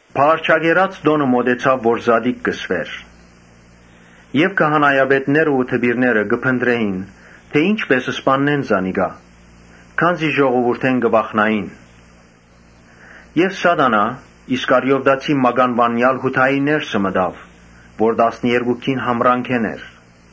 Բաղարջակերաց տօնը մօտեցաւ, որ զատիկ կը կոչուէր։ Քահանայապետներն ու դպիրները կը փնտռէին թէ ի՞նչպէս սպաննեն զանիկա, քանզի ժողովուրդէն կը վախնային։ Սատանան՝ Իսկարիովտացի մականուանեալ Յուդային ներսը մտաւ, որ տասներկուքէն մէկն էր։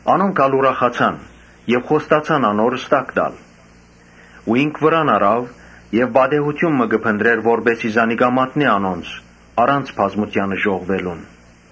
Անոնք ալ ուրախացան եւ խոստացան անոր ստակ տալ։ Ինք վրան առաւ հարցը եւ պատեհութիւն մը կը փնտռէր, որպէս զի զանիկա մատնէ անոնց՝ դեռ բազմութիւնը չժողվուած։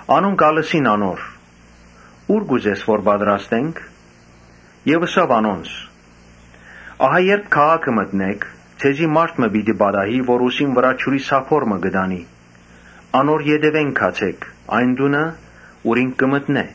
Անոնք ալ ըսին անոր. «Ո՞ւր կ’ուզես որ պատրաստենք»։ Ըսաւ անոնց. «Երբ քաղաքը մտնէք, ձեզի մարդ մը պիտի պատահի, որ ուսին վրայ ջուրի սափոր մը ունի. անոր ետեւէն գացէք այն տունը, ուր ինք կը մտնէ։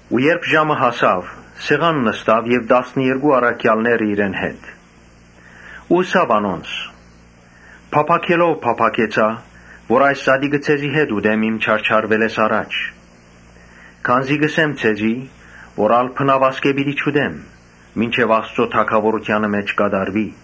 Երբ ժամը հասաւ, սեղան նստաւ տասներկու առաքեալներուն հետ, ըսելով. «Փափաքելով փափաքեցայ որ այս զատիկը ձեզի հետ ուտեմ իմ չարչարուելէս առաջ։ Քանզի կ’ըսեմ ձեզի թէ ալ բնաւ ասկէ պիտի չուտեմ՝ մինչեւ Աստուծոյ թագաւորութեանը մէջ կատարուի»։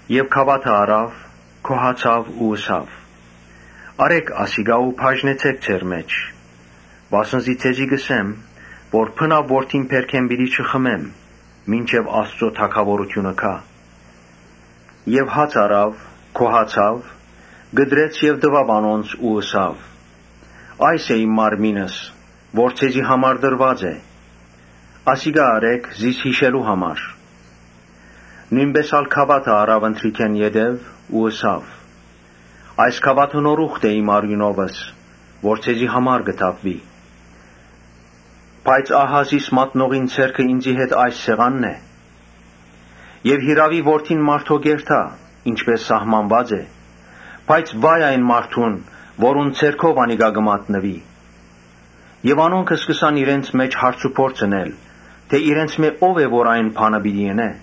Եւ գաւաթը առաւ, գոհացաւ ու ըսաւ. «Առէ՛ք ասիկա ու բաժնեցէք ձեր մէջ. Վասն զի ձեզի կ’ըսեմ թէ բնաւ որթին բերքէն պիտի չխմեմ՝ մինչեւ Աստուծոյ թագաւորութիւնը գայ»։ Հաց առաւ, գոհացաւ, կտրեց եւ տուաւ անոնց ու ըսաւ. «Այս է իմ մարմինս, որ ձեզի համար տրուած է. ասիկա ըրէք զիս յիշելու համար»։ Նոյնպէս ալ գաւաթը առաւ ընթրիքէն յետոյ ու ըսաւ. «Այս գաւաթը նոր ուխտ է իմ արիւնովս, որ ձեզի համար պիտի թափուի»։ «Բայց ահա զիս մատնողին ձեռքը ինծի հետ այս սեղանին վրայ է։ Յիրաւի Որդին մարդոյ կ’երթայ՝ ինչպէս սահմանուած է, բայց վա՜յ այն մարդուն՝ որուն ձեռքով անիկա պիտի մատնուի»։ Անոնք սկսան իրենց մէջ հարցուփորձ ընել՝ թէ իրենցմէ ո՞վ է որ այդ բանը պիտի ընէ։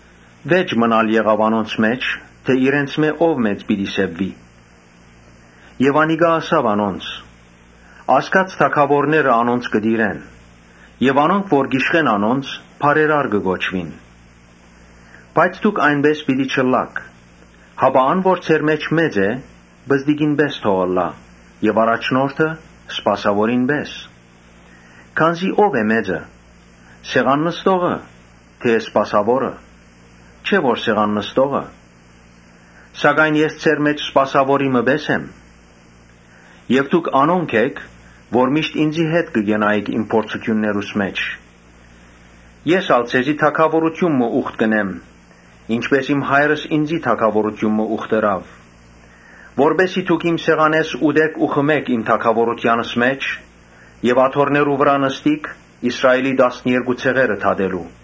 Վէճ մըն ալ եղաւ անոնց մէջ՝ թէ իրենցմէ ո՞վ մեծ պիտի սեպուի։ Յիսուս ըսաւ անոնց. «Ազգերու թագաւորները անոնց կը տիրեն եւ անոնք որ կ’իշխեն անոնց՝ բարերար կը կոչուին։ Բայց դուք այնպէս պէտք չէ ըլլաք, հապա ան որ ձեր մէջ մեծ է, պզտիկի պէս թող ըլլայ եւ առաջնորդը՝ սպասաւորի պէս։ Քանզի ո՞վ է մեծը, սեղան նստո՞ղը թէ սպասաւորը։ Չէ՞ որ սեղան նստողը. սակայն ես ձեր մէջ սպասաւորի մը պէս եմ։ Եւ դուք անոնք էք՝ որ միշտ ինծի հետ կը կենայիք իմ փորձութիւններուս մէջ. Ես կ’ուխտեմ ձեզի թագաւորութիւն մը, ինչպէս իմ Հայրս ինծի թագաւորութիւն մը տալ ուխտեց. Որպէս զի դուք իմ սեղանէս ուտէք ու խմէք իմ թագաւորութեանս մէջ եւ աթոռներու վրայ նստիք Իսրայէլի տասներկու ցեղերը դատելու»։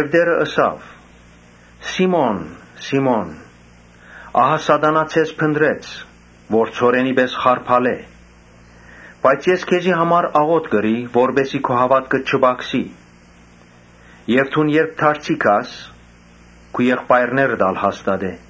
Տէրը ըսաւ. «Սի՛մոն, Սի՛մոն, ահա Սատանան ձեզ փնտռեց, որ ցորենի պէս խարբալէ. Բայց ես քեզի համար աղօթք ըրի, որպէս զի քու հաւատքդ չպակսի եւ դուն երբ դարձի գաս, քու եղբայրներդ ալ հաստատես»։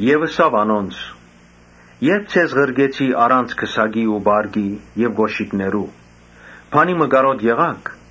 Ապա ըսաւ անոնց. «Երբ ձեզ ղրկեցի առանց քսակի ու պարկի եւ կօշիկներու, բանի մը կարօտ եղա՞ք»։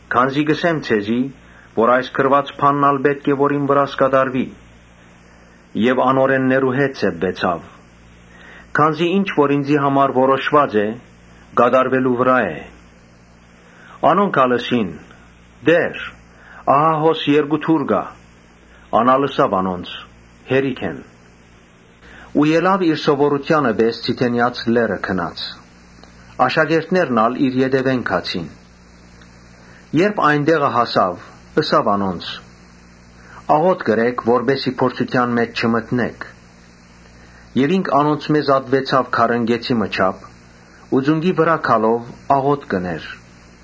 Քանզի կ’ըսեմ ձեզի թէ այս գրուած բանն ալ պէտք է որ իմ վրաս կատարուի՝ ‘Եւ անօրէններու հետ սեպուեցաւ’. քանզի ինչ որ ինծի համար որոշուած է, կատարուելու վրայ է»։ Անոնք ալ ըսին. «Տէ՛ր, ահա հոս երկու թուր կայ»։ Ան ալ ըսաւ անոնց. «Հերիք են»։ Յետոյ իր սովորութեանը պէս Ձիթենեաց լեռը ելաւ։ Աշակերտներն ալ իր ետեւէն գացին։ Ու երբ տեղը հասաւ ըսաւ անոնց. «Աղօթք ըրէք որպէս զի փորձութեան մէջ չմտնէք»։ Եւ ինք անոնցմէ զատուեցաւ քարընկէցի մը չափ ու ծունկի վրայ գալով աղօթք կ’ընէր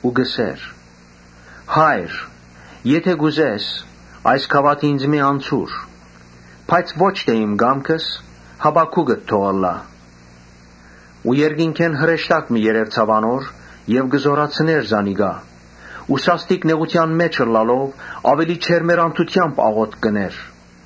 Ու կ’ըսէր. «Հա՛յր, եթէ կ’ուզես, այս գաւաթը ինծմէ անցուր. բայց ոչ թէ իմ կամքս՝ հապա քուկդ թող ըլլայ»։ Երկնքէն հրեշտակ մը երեւցաւ անոր եւ զօրացուց զանիկա։ Սաստիկ նեղութեան մէջ ըլլալով՝ աւելի ջերմեռանդութեամբ աղօթք ըրաւ։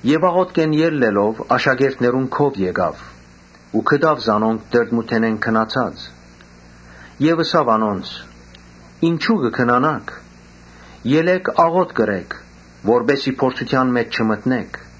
Աղօթքէն ելլելով՝ աշակերտներուն քով եկաւ ու գտաւ զանոնք տրտմութենէն քնացած։ Ըսաւ անոնց. «Ինչո՞ւ կը քնանաք. ելէք աղօթք ըրէք, որպէս զի փորձութեան մէջ չմտնէք»։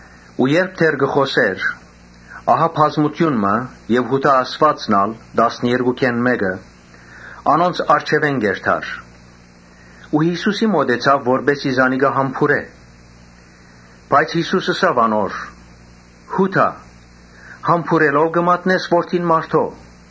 Երբ կը խօսէր, բազմութիւն մը եւ Յուդան, տասներկուքէն մէկը, որ անոնց առջեւէն կու գար, Յիսուսին մօտեցաւ, որպէս զի զանիկա համբուրէ։ Բայց Յիսուս ըսաւ անոր. «Յո՛ւդա, համբուրելո՞վ կը մատնես Որդին մարդոյ»։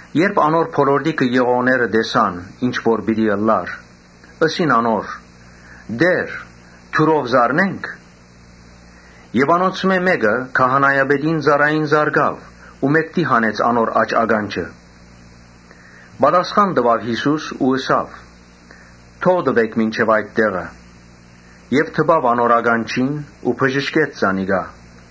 Երբ անոր բոլորտիքը եղողները տեսան ինչ որ պիտի ըլլար, ըսին անոր. «Տէր, թուրով զարնե՞նք»։ Անոնցմէ մէկը քահանայապետին ծառային զարկաւ ու մէկդի հանեց անոր աջ ականջը։ Պատասխան տուաւ Յիսուս ու ըսաւ. «Կը բաւէ»։ Եւ դպաւ անոր ականջին ու բժշկեց զանիկա։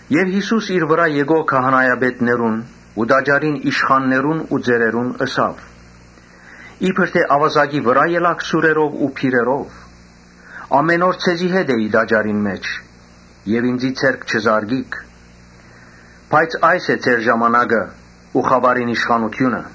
Յիսուս իր վրայ եկող քահանայապետներուն ու տաճարին իշխաններուն ու ծերերուն ըսաւ. «Իբր թէ աւազակի՞ վրայ ելաք սուրերով ու բիրերով։ Ամէն օր ձեզի հետ էի տաճարին մէջ եւ ինծի ձեռք չզարկիք, բայց այս է ձեր ժամանակը ու խաւարին իշխանութիւնը»։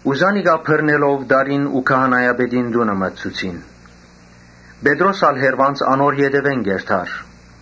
Զանիկա բռնելով տարին ու քահանայապետին տունը մտցուցին. Պետրոս ալ հեռուէն անոր ետեւէն կ’երթար։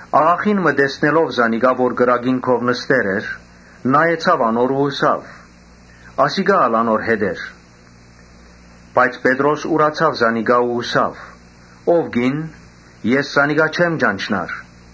Աղախին մը տեսնելով զանիկա որ կրակին քով նստեր էր, նայեցաւ անոր ու ըսաւ. «Ասիկա ալ անոր հետ էր»։ Բայց Պետրոս ուրացաւ զանիկա ու ըսաւ. «Ո՛վ կին, ես զանիկա չեմ ճանչնար»։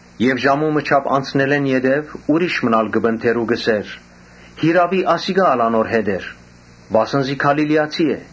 Եւ ժամու մը չափ անցնելէն յետոյ՝ ուրիշ մըն ալ կը պնդէր ու կ’ըսէր. «Յիրաւի ասիկա ալ անոր հետ էր, վասն զի Գալիլիացի է»։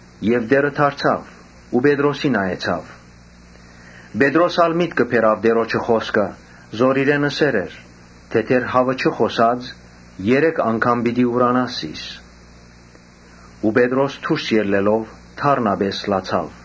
Տէրը դարձաւ ու Պետրոսին նայեցաւ։ Պետրոս ալ միտքը բերաւ Տէրոջը խօսքը, որ իրեն ըսեր էր թէ՝ ‘Դեռ հաւը չխօսած՝ երեք անգամ պիտի ուրանաս զիս’։ Պետրոս դուրս ելլելով դառնապէս լացաւ։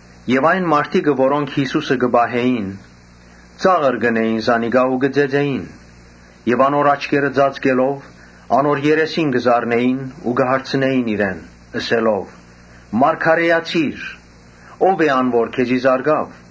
Այն մարդիկը, որոնք Յիսուսը կը պահէին, կը ծաղրէին զանիկա ու կը ծեծէին. Եւ անոր աչքերը ծածկելով՝ անոր երեսին կը զարնէին ու կը հարցնէին իրեն՝ ըսելով. «Մարգարէացի՛ր։ Ո՞վ է ան, որ քեզի զարկաւ»։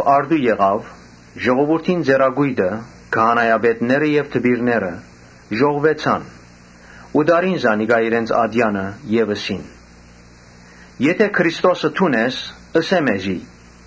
Առտուն, ժողովուրդին ծերակոյտը, քահանայապետները եւ դպիրները ժողվուեցան ու տարին զանիկա իրենց ատեանը եւ ըսին. «Եթէ Քրիստոսը դուն ես, ըսէ մեզի»։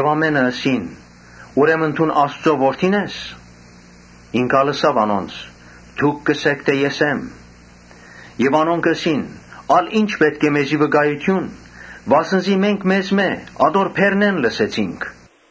Ամէնքը ըսին. «Ուրեմն դուն Աստուծոյ Որդի՞ն ես»։ Ինք ալ ըսաւ անոնց. «Դուք կ’ըսէք թէ ես եմ»։ Եւ անոնք ալ ըսին. «Ալ ի՞նչ պէտք է մեզի վկայութիւն, վասն զի մենք անձամբ անոր բերնէն լսեցինք»։